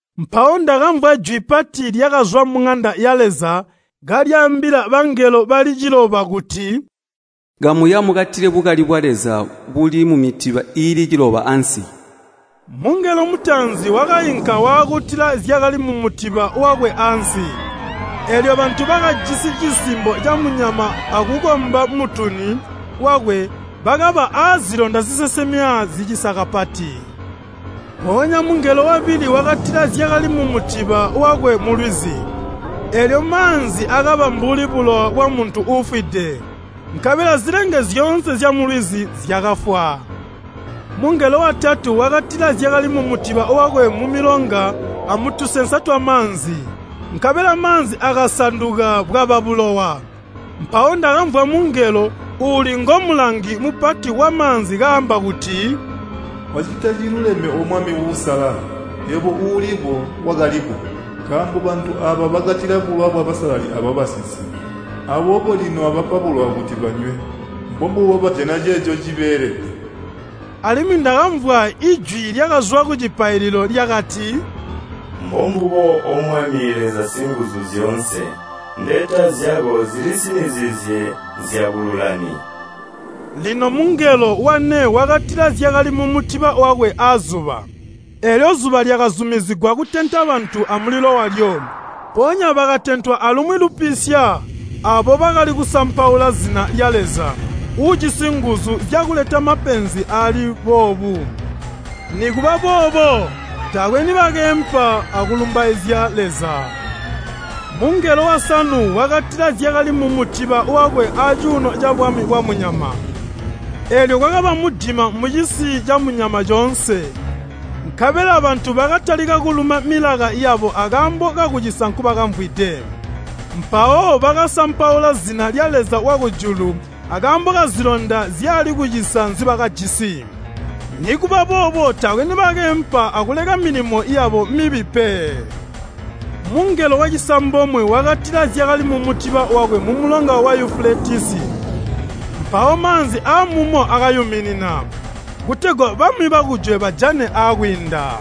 Mpawo ndakamvwa jwi pati lyakazwa muŋanda ya Leza kalyaambila bangelo bali ciloba kuti, “Kamuya mukatile bukali bwa Leza buli mumitiba iili ciloba ansi!” Mungelo mutaanzi wakainka waakutila zyakali mumutiba wakwe ansi. Eelyo bantu bakajisi cisimbo camunyama akukomba mutuni wakwe bakaba aazilonda zisesemya zicisa kapati. Mpoonya mungelo wabili wakatila zyakali mumutiba wakwe mulwizi. Eelyo maanzi akaba mbuli bulowa bwamuntu uufwide, nkabela zilenge zyoonse zyamulwizi zyakafwa. Mungelo watatu wakatila zyakali mumutiba wakwe mumilonga amutusensa twamaanzi, nkabela maanzi akasanduka bwaba bulowa. Mpawo ndakamvwa mungelo, uuli ngomulangi mupati wamaanzi kaamba kuti, “Wacita ciluleme O Mwami Uusalala, yebo Uuliko, Wakaliko! Nkaambo bantu aaba bakatila bulowa bwabasalali abwabasinsimi, aboobo lino wabapa bulowa kuti banywe. Mbombubo, bajana ceeco cibeelede!” Alimwi ndakamvwa ijwi lyakazwa kucipaililo, lyakati, “Mbombubo O Mwami Leza Singuzyoonse, mbeta zyako zilisinizizye nzyabululami!” Lino mungelo wane wakatila zyakali mumutiba wakwe azuba, eelyo zuba lyakazumizigwa kutenta bantu amulilo walyo. Mpoonya bakatentwa alumwi lupisya aabo bakali kusampaula zina lya Leza uujisi nguzu zyakuleta mapenzi aali boobu. Nikuba boobo taakwe nibakeempa akulumbaizya Leza. Mungelo wasanu wakatila zyakali mumutiba wakwe acuuno cabwami bwamunyama, eelyo kwakaba mudima mucisi camunyama coonse, nkabela bantu bakatalika kuluma milaka yabo akaambo kakucisa nkubakamvwide. Mpawo bakasampaula zina lya Leza wakujulu akaambo kazilonda zyali kucisa nzibakajisi. Nikuba boobo taakwe nibakeempa akuleka milimo yabo mibi pe. Mungelo wacisambomwe wakatila zyakali mumutiba wakwe mumulonga wa Yufuletisi, mpawo maanzi aamumo akayuminina, kutegwa bami bakujwe bajane aakwiinda.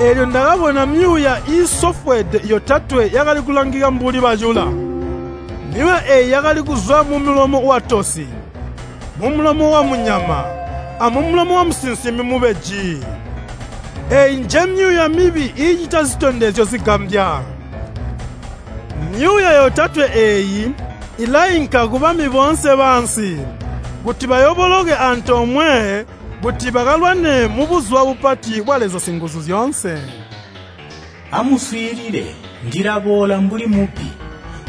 Eelyo ndakabona myuuya iisofweede yotatwe yakali kulangika mbuli bacula. Myuuya eeyi yakali kuzwa mumulomo watosi, mumulomo wamunyama, amumulomo wamusinsimi mubeji. Eeyi njemyuuya mibi iicita zitondezyo zigambya. Myuuya yotatwe eeyi ilainka kubami boonse baansi kuti bayooboloke antoomwe kuti bakalwane mubuzuba bupati bwa Leza Singuzyoonse. “Amuswiilile! Ndilaboola mbuli mubbi.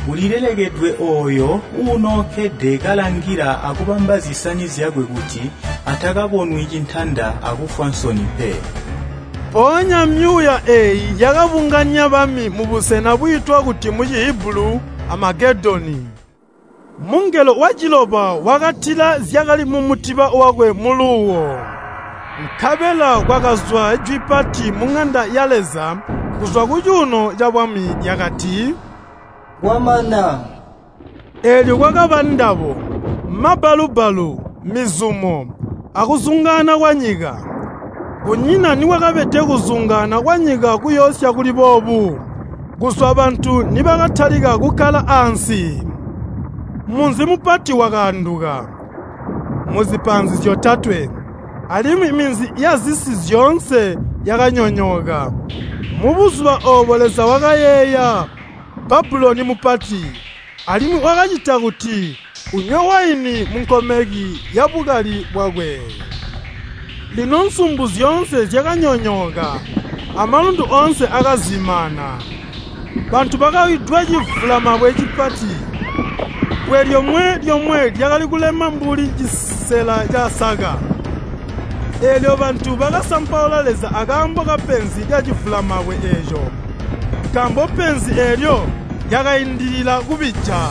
Ulilelekedwe ooyo uunookkede kalangila akubamba zisani zyakwe kuti atakabonwi cintanda akufwa nsoni pe.” Mpoonya myuuya eeyi yakabunganya bami mubusena bwiitwa kuti mu Cihibulu Amagedoni. Mungelo waciloba wakatila zyakali mumutiba wakwe muluuwo. Nkabela kwakazwa jwi pati muŋanda ya Leza, kuzwa kucuuno cabwami lyakati, “Kwamana!” Eelyo kwakaba ndabo, mabbalu-bbalu, mizumo, akuzungaana kwanyika. Kunyina nikwakabede kuzungaana kwanyika kuyoosya kuli boobu kuzwa bantu nibakatalika kukkala ansi! Munzi mupati wakaanduka muzipaanzi zyotatwe, alimwi minzi yazisi zyoonse yakanyonyooka. Mubuzuba oobo Leza wakayeeya Babuloni mupati, alimwi wakacita kuti unywe waini munkomeki yabukali bwakwe. Lino nsumbu zyoonse zyakanyonyooka, amalundu oonse akazimaana. Bantu bakawidwa civulamabwe cipati, bbwe lyomwe-lyomwe lyakali kulema mbuli cisela casaka. Eelyo bantu bakasampaula Leza akaambo kapenzi lyacivulamabwe eeco, nkaambo penzi eelyo lyakaindilila kubija.